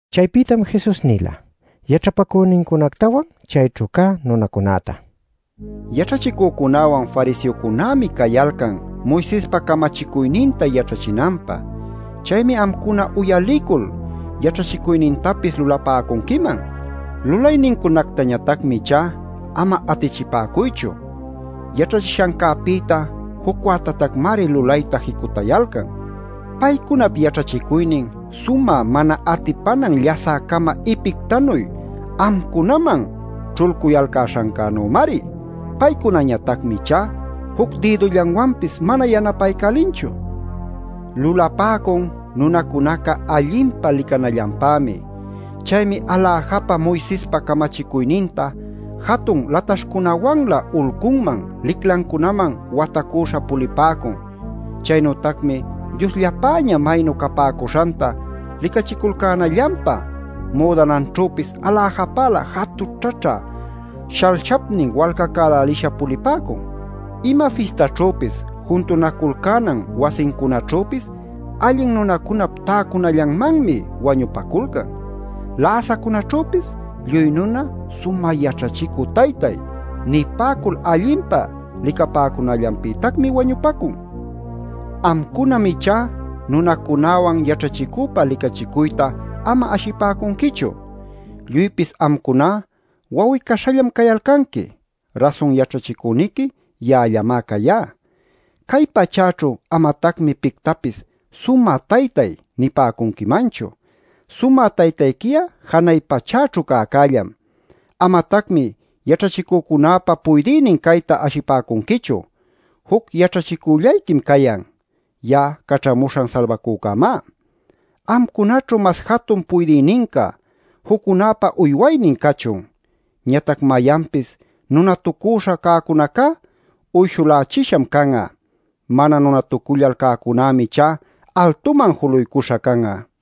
Chaypïtam Jesus nila yaćhapacünincunactawan chayćhu cä nunacunäta: “Yaćhachicücunäwan, fariseocunämi cayalcan Moisespa camachicuyninta yaćhachinanpä. Chaymi amcuna uyalicul yaćhachicuynintapis lulapäcunquiman. Lulaynincunactañatacmi ichá ama atichipäcuychu; yaćhachishancäpïta jucwätatacmari lulayta jicutayalcan. Paycunap yaćhachicuynin sumä mana atipanan llasä-cama ipictanuy amcunaman ćhulcuyalcäśhannümari. Paycunañatacmi ichá juc dïdullawanpis mana yanapaycälinchu. Lulapäcun nunacunaca allinpa licanallanpämi. Chaymi aläjapa Moisespa camachicuyninta jatun lataśhcunawanlä ulcunman, liclancunaman watacuśha pulipäcun. Chaynütacmi Diosllapäña maynu capäcuśhanta licachiculcänallanpä müdananćhüpis aläjapälä jatućhaćhä shalshipnin walcacälälisha pulipäcun. “Ima fistaćhüpis juntunaculcänan wasincunaćhüpis allin nunacunap täcunallanmanmi wañupaculcan. Läsacunäćhüpis lluy nuna ‘sumä yaćhachicü taytay’ nipäcul allinpa licapäcunallanpïtacmi wañupacun. “Amcunam ichá nunacunäwan yaćhachicüpa licachicuyta ama ashipäcunquichu. Lluypis amcuná wawi-caśhallam cayalcanqui; rasun yaćhachicüniqui ya'allamá cayá. Cay pachäćhu amatacmi pictapis ‘sumä taytay’ nipäcunquimanchu. Sumä taytayqui'a janay pachäćhu cäcällam. Amatacmi yaćhachicücunäpa puydïnin cayta ashipäcunquichu. Juc yaćhachicüllayquim cayan: ya'a Caćhamuśhan Salbacücämá. Amcunaćhu mas jatun puydïninca, juccunäpa uywaynin cachun. Ñatac mayanpis nunatucüśha cäcunacá uyshulächisham can'a. Mana nunatucullal cäcunämi ichá altuman juluycuśha can'a.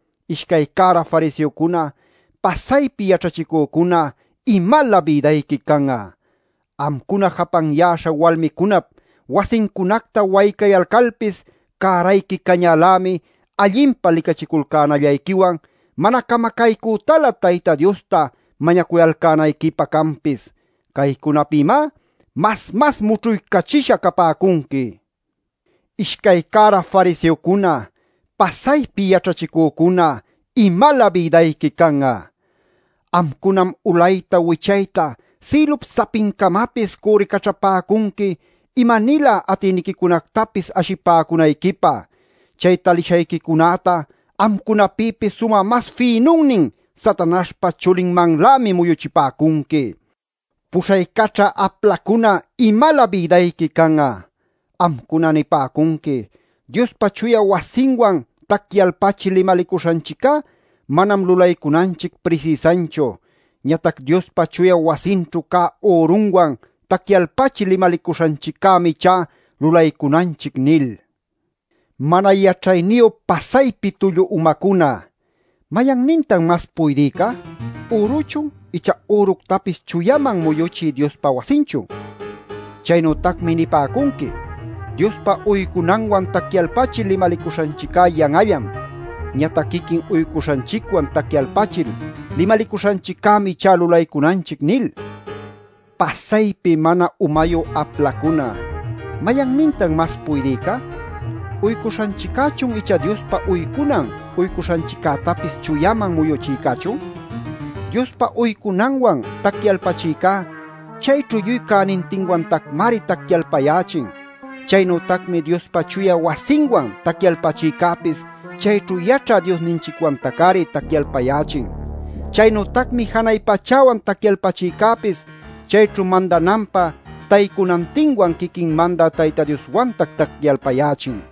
“Ishcay cära fariseocuna, pasaypi yaćhachicücuna, ¡imalä bïdayqui can'a! Amcuna japanyäśha walmicunap wasincunacta waycayalcalpis cärayqui cañälämi allinpa licachiculcänallayquiwan mana camacaycütalä Tayta Diosta mañacuyalcänayquipä canpis. Caycunapïmá mas mas mućhuycachisha capäcunqui.˼ “Ishcay cära fariseocuna, pasaypi yaćhachicücuna, ¡imalä bïdayqui can'a! Amcunam ulayta wichayta sïlup sapincamapis cürricaćhapäcunqui ima-nilä atïniquicunactapis ashipäcunayquipä. Chay talishayquicunäta amcunapïpis sumä mas fïnunnin Satanaśhpa chulinmanlämi muyuchipäcunqui. “Puśhaycaćhä aplacuna ¡imalä bïdayqui can'a! Amcuna nipäcunqui: ‘Diospa chuya wasinwan tacyalpachil limalicuśhanchiccá manam lulaycunanchic prisïsanchu. Ñatac Diospa chuya wasinćhu cä ürunwan tacyalpachil limalicuśhanchiccämi ichá lulaycunanchic’ nil. ¡Mana yaćhayniyu pasaypi tullu umacuna! ¿Mayannintan mas puydïca? ¿Üruchun icha üructapis chuyaman muyuchï Diospa wasinchun? Chaynütacmi nipäcunqui: ‘Diospä uycunanwan tacyalpachil limalicuśhanchiccá yan'allam. Ñatac quiquin uycuśhanchicwan tacyalpachil limalicuśhanchiccämi ichá lulaycunanchic’ nil. Pasaypi mana umayu aplacuna. ¿Mayannintan mas puydïca? ¿Uycuśhanchiccächun icha Diospä uycunan uycuśhanchiccätapis chuyaman muyuchïcächun? Diospä uycunanwan tacyalpachïcá chayćhu lluy cänintinwantacmari tacyalpayächin. Chaynütacmi Diospa chuya wasinwan tacyalpachïcäpis chayćhu yaćhä Diosninchicwantac-ari tacyalpayächin. Chaynütacmi janay pachäwan tacyalpachïcäpis chayćhu mandananpä taycunantinwan quiquin mandä Tayta Dioswantac tacyalpayächin.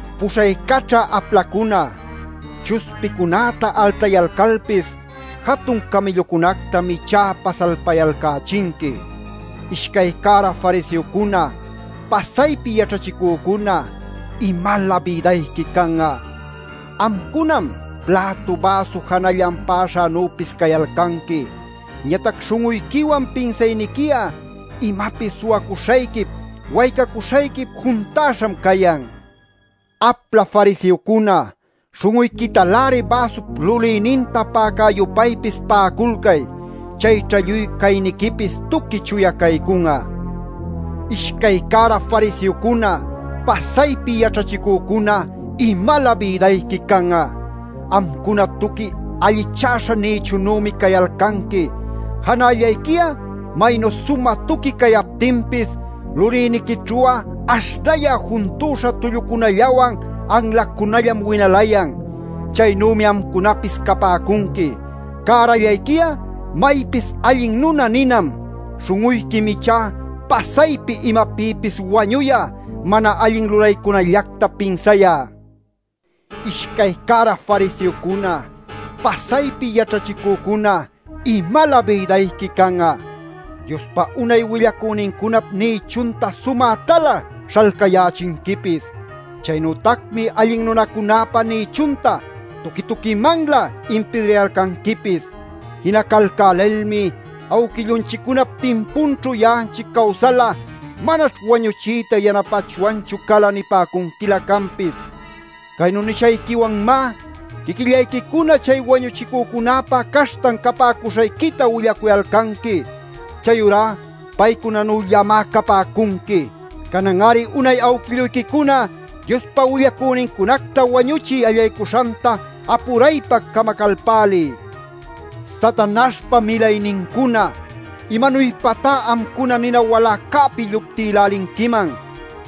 Puśhaycaćhä aplacuna, chuspichacunäta altayalcalpis, jatun camïllucunätam ichá pasalpayalcächinqui. “Ishcay cära fariseocuna, pasaypi yaćhachicücuna, ¡imalä bïdayqui can'a! Amcunam plätu, bäsu janallan pa'aśhanüpis cayalcanqui. Ñatac śhun'uyquiwan pinsayniqui'a imapis suwacuśhayquip, waycacuśhayquip juntäśham cayan. Apla fariseocuna. Śhun'uyquitaläri bäsup lulïninta pa'acä-yupaypis pa'aculcay. Chayćha lluy cayniquipis tuqui chuya caycun'a. “Ishcay cära fariseocuna, pasaypi yaćhachicücuna, ¡imalä bïdayqui can'a! Amcuna tuqui allichäśha nïchunümi cayalcanqui. Janallayqui'a maynu sumä tuqui cayaptinpis lulïniquićhu'a aśhnayä junta tullucunallawan anlacunallam winalayan. Chaynümi amcunapis capäcunqui. Cärallayqui'a maypis ‘allin nuna’ ninam. Śhun'uyquim ichá pasaypi imapïpis wañuyä, mana allin lulaycunallacta pinsayä. “Ishcay cära fariseocuna, pasaypi yaćhachicücuna, ¡imalä bïdayqui can'a! Diospa unay willacünincunap nïchunta sumätalä śhalcayächinquipis. Chaynütacmi allin nunacunäpa nïchunta tuqui-tuquimanlä impidrayalcanquipis. Jinacalcälilmi: ‘Awquillunchiccunap timpunćhu ya'anchic cawsal'a, manaćh wañuchiyta yanapayachwanchu cala’ nipäcunquilä canpis. Caynu nishayquiwanmá quiquillayquicuna chay wañuchïcunäpa caśhtan capäcuśhayquita willacuyalcanqui. Chayurá paycunanüllamá capäcunqui. Canan-ari unay awquilluyquicuna Diospa willacünincunacta wañuchiy allaycuśhanta apuraypa camacalpäliy. “Satanaśhpa milaynincuna, ¿imanuypatá amcuna nina waläcäpi lluptïlälinquiman?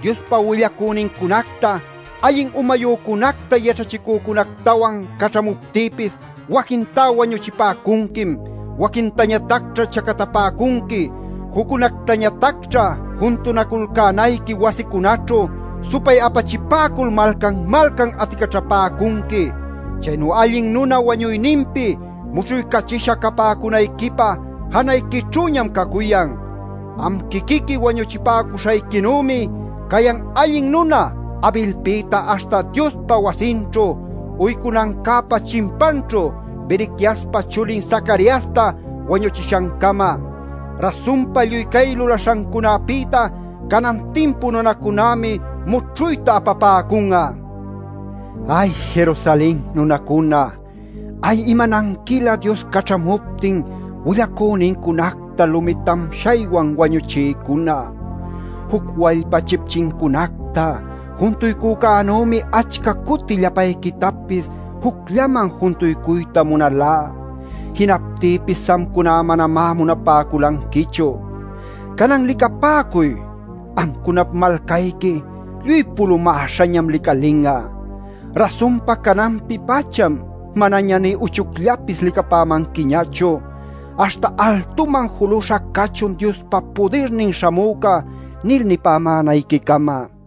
Diospa willacünincunacta, allin umayücunacta yaćhachicücunactawan caćhamuptïpis waquintá wañuchipäcunquim. Waquintañatacćha chacatapäcunqui. Juccunactañatacćha juntunaculcänayqui wasicunaćhu supay-apachipäcul malcan-malcan aticaćhapäcunqui. Chaynu allin nuna wañuyninpi mućhuycachisha capäcunayquipä janayquićhüñam cacuyan. Am quiquiqui wañuchipäcuśhayquinümi cayan allin nuna Abelpïta aśhta Diospa wasinćhu uycunancäpa chimpanćhu Berequiaspa chulin Zacariasta wañuchishancama. Rasunpa lluy cay lulaśhancunapïta canan timpu nunacunämi mućhuyta apapäcun'a. “¡Ay, Jerusalen nunacuna! ¡Ay, imananquilä Dios caćhamuptin willacünincunacta lumi tamshaywan wañuchïcuna! Juc wallpa chipchincunacta juntuycücänümi achca cuti llapayquitapis jucllaman juntuycuyta munalá. Jinaptïpis amcuna manamá munapäculanquichu. Canan licapäcuy; amcunap malcayqui lluy pulumäśhañam licalin'a. Rasunpa cananpi-pacham manaña nï uchucllapis licapämanquiñachu aśhta ‘¡Altuman juluśha cachun Diospa Pudirnin Śhamüca!’ nil nipämänayquicama” nila.